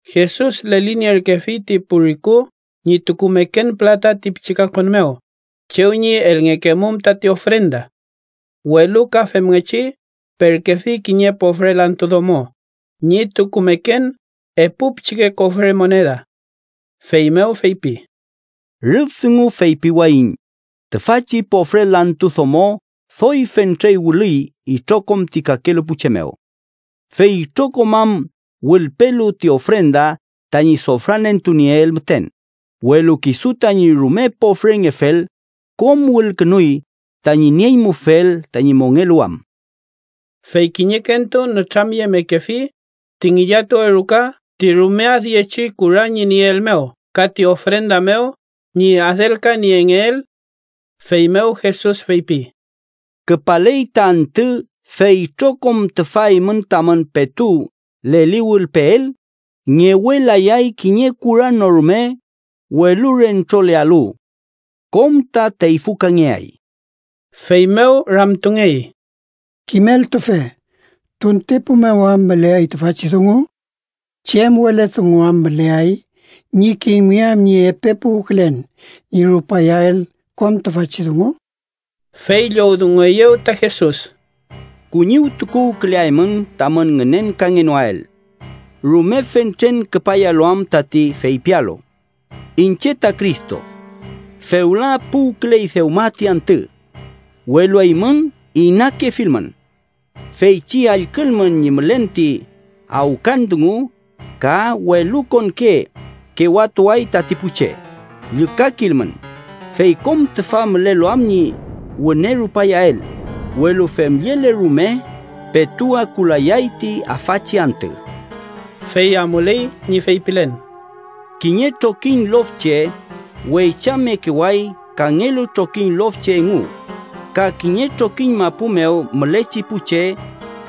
Jesus lelinierkefi ti pu riku ñi tukumeken pülata ti pichi kakon mew chew ñi elngekemum tati ofrenda. Welu ka femngechi perkefi kiñe pofre lantu domo ñi tukumeken epu pichike kofre moneda. Feymew feypi: —Rüf dungu feypiwayiñ tüfachi pofre lantu domo doy fentre wülüy itrokom ti kakelu pu che mew. Fey itrokom am wülpelu ti ofrenda tañi sofranentunieel müten, welu kisu, tañi rume pofrengefel, kom wülkünuy tañi nieñmufel tañi mongeluwam. Fey kiñekentu nütramyemekefi ti ngillatuwe ruka ti rume adyechi kura ñi nieel mew ka ti ofrenda mew ñi adelkaniengeel. Feymew Jesus feypi: —Küpaley ta antü fey itrokom tüfa eymün tamün petu leliwülpeel, ngewelayay kiñe kura no rume welu rentrolealu. Kom ta teyfükangeay. Feymew ramtungey: —Kimeltufe, ¿tuntepu mew am müleay tüfachi dungu? ¿Chem wele dungu am müleay ñi kimngeam ñi epe puwkülen ñi rupayael kom tüfachi dungu? Fey llowdungueyew ta Jesus: “Kuñiwtukuwküleaymün tamün ngünenkangenoael. Rume fentren küpayalu am tati feypialu: ‘Iñche ta Cristo. Fewla puwküley dewma ti antü.’ Welu eymün inakefilmün. Feychi allkülmün ñi mülen ti awkan dungu ka welukonke kewatuay tati pu che, llükakilmün, fey kom tüfa mülelu am ñi wüne rupayael, welu femllele rume petu akulayay ti afachi antü.” Fey amuley ñi feypilen: “Kiñe trokiñ lof che weychamekeway kangelu trokiñ lof che engu ka kiñe trokiñ mapu mew mülechi pu che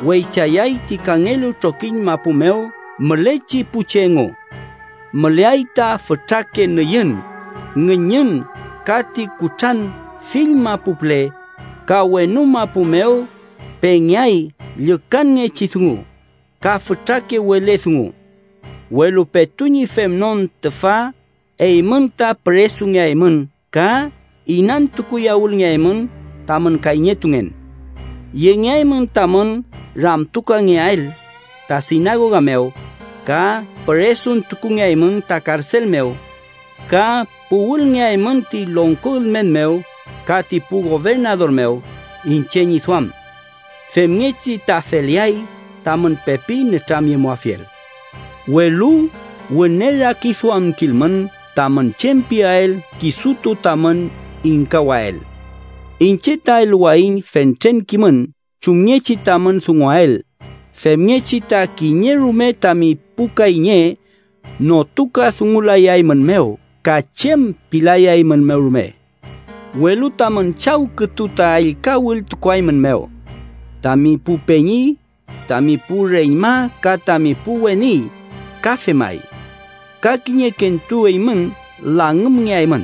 weychayay ti kangelu trokiñ mapu mew mülechi pu che engu. Müleay ta fütrake nüyün, ngüñün ka ti kutran fill mapu püle, ka wenu mapu mew pengeay llükanngechi dungu ka fütrake wele dungu. “Welu petu ñi femnon tüfa eymün ta püresungeaymün ka inantukuyawülngeaymün tamün kayñetungen. Yengeaymün tamün ramtukangeael ta sinagoga mew, ka püresuntukungeaymün ta karsel mew ka puwülngeaymün ti longko ülmen mew ka ti pu gobernador mew iñche ñi duam. Femngechi ta feleay tamün pepi nütramyemuafiel. Welu wüne rakiduamkilmün tamün chem piael kisutu tamün ingkawael. Iñche ta eluwayiñ fentren kimün chumngechi tamün dunguael, femngechi ta kiñe rume tami pu kayñe notukadungulayaeymünmew ka chem pilayaeymünmew rume. Welu tamün chaw kütu ta ellka wültukuaeymünmew. Tami pu peñi, tami pu reñma ka tami pu weni ka femay. Ka kiñekentu eymün langümngeaymün.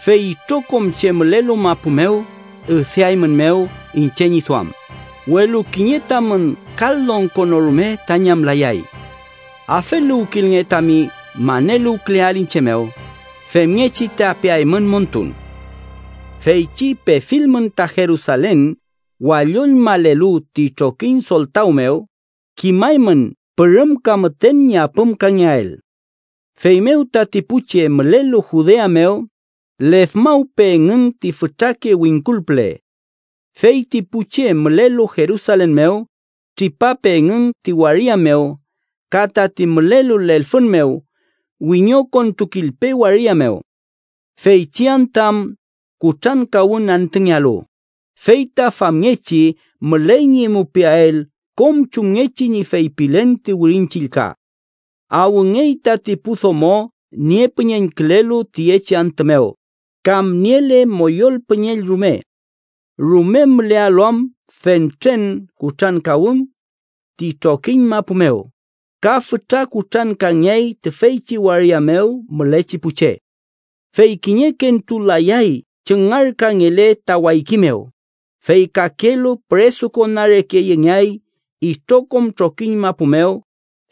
Fey itrokom che mülelu mapu mew üdeaeymünmew iñche ñi duam, welu kiñe tamün kal longko no rume ta ñamlayay. ¡Afeluwkilnge tami maneluwküleael iñche mew, femngechi ta peaymün montun! “Feychi pefilmün ta Jerusalen walloñmalelu ti trokiñ soltaw mew, kimaymün pürümka müten ñi apümkangeael. Feymew tati pu che mülelu Judea mew, lefmawpe engün ti fütrake wingkul püle. Fey ti pu che mülelu Jerusalen mew, tripape engün ti waria mew, ka tati mülelu lelfün mew, wiñokontukilpe waria mew. Feychi antü am kutrankawün antüngealu, fey ta famngechi müley ñi mupiael kom chumngechi ñi feypilen ti Wirin Chillka. ¡Awngey tati pu domo niepüñeñkülelu tüyechi antü mew kam niele moyol püñeñ rume! Rume mülealu am fentren kutrankawün ti trokiñ mapu mew, ka fütra kutrankangeay tüfeychi waria mew mülechi pu che. Fey kiñekentu layay chüngarkangele ta wayki mew, fey kakelu püresukona reke yengeay itrokom trokiñ mapu mew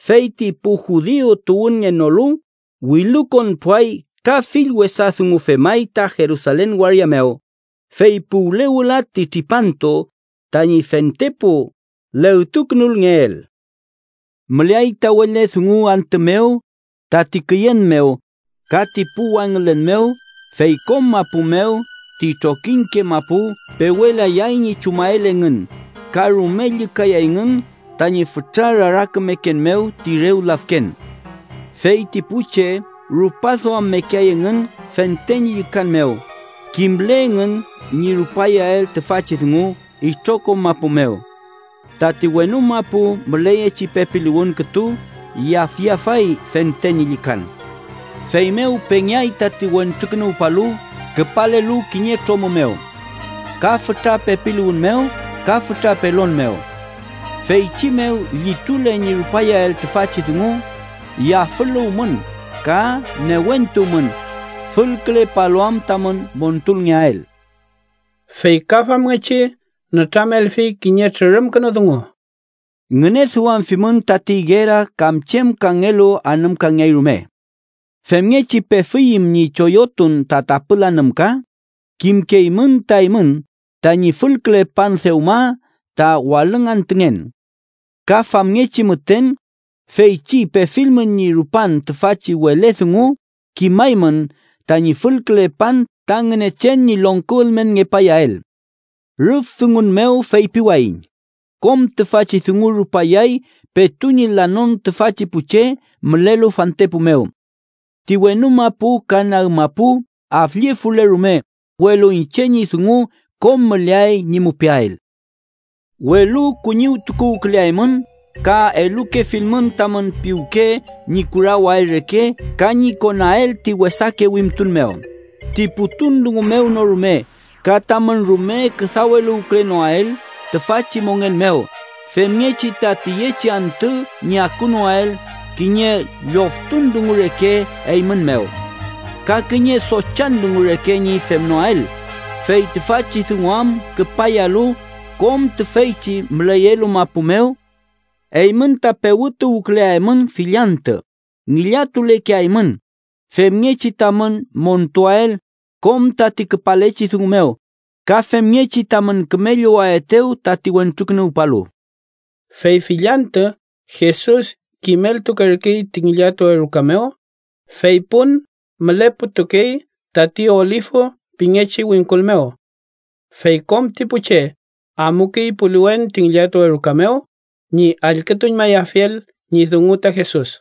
fey ti pu judiu tuwünngenolu wilukonpuay ka fill wesa dungu femay ta Jerusalen waria mew, fey puwle wüla ti tripantu tañi fentepu legtukünulngeel. “Müleay ta wele dungu antü mew, tati küyen mew, ka ti pu wangülen mew fey kom mapu mew ti trokiñke mapu pewelayay ñi chumael engün ka rume llükayayngün tañi fütra rarakümeken mew ti rew lafken. Fey ti pu che rupaduammekeay engün fente ñi llükan mew kimle engün ñi rupayael tüfachi dungu itrokom mapu mew. Tati wenu mapu müleyechi pepiluwün kütu yafyafay ñi fente llükan. Feymew pengeay tati Wentrukünuwpalu küpalelu kiñe tromü mew ka fütra pepiluwün mew ka fütra pelon mew. Feychi mew llitule ñi rupayael tüfachi dungu, yafüluwmün ka newentuwmün, fülkülepalu am tamün montulngeael.” Fey ka femngechi nütramelfi kiñe trürümkünu dungu: “Ngüneduamfimün tati igera kam chem kangelu anümkangeay rume. Femngechi pefiyüm ñi choyotun ta tapül anümka kimkeymün ta eymün tañi fülkülepan dewma ta walüngantüngen. Ka famngechi müten, feychi pefilmün ñi rupan tüfachi wele dungu, kimaymün tañi fülkülepan ta Ngünechen ñi longko ülmenngepayael. “Rüf dungun mew feypiwayiñ kom tüfachi dungu rupayay petu ñi lanon tüfachi pu che mülelu fantepu mew. Ti wenu mapu ka nag mapu afllefule rume, welu iñche ñi dungu kom müleay ñi mupiael. “Welu kuñiwtukuwküleaymün ka elukefilmün tamün piwke ñi kurawael reke ka ñi konael ti wesake wimtun mew, ti putun dungu mew no rume ka tamün rume küdaweluwkülenoael tüfachi mongen mew femngechi ta tüyechi antü ñi akunoael kiñe lloftun dungu reke eymün mew. Ka kiñe sochan dungu reke ñi femnoael. Fey tüfachi dungu am küpayalu kom tüfeychi müleyelu mapu mew. Eymün ta pewütuwküleaymün, fill antü ngillatulekeaymün, femngechi tamün montuael kom tati küpalechi dungu mew ka femngechi tamün küme llowaetew tati Wentrukünuwpalu.” Fey fill antü Jesus kimeltukerkey ta ngillatuwe ruka mew, fey pun müleputukey tati Olifu pingechi wingkul mew. Fey kom ti pu che amukey puliwen ti ngillatuwe ruka mew ñi allkütuñmayafiel ñi dungu ta Jesus.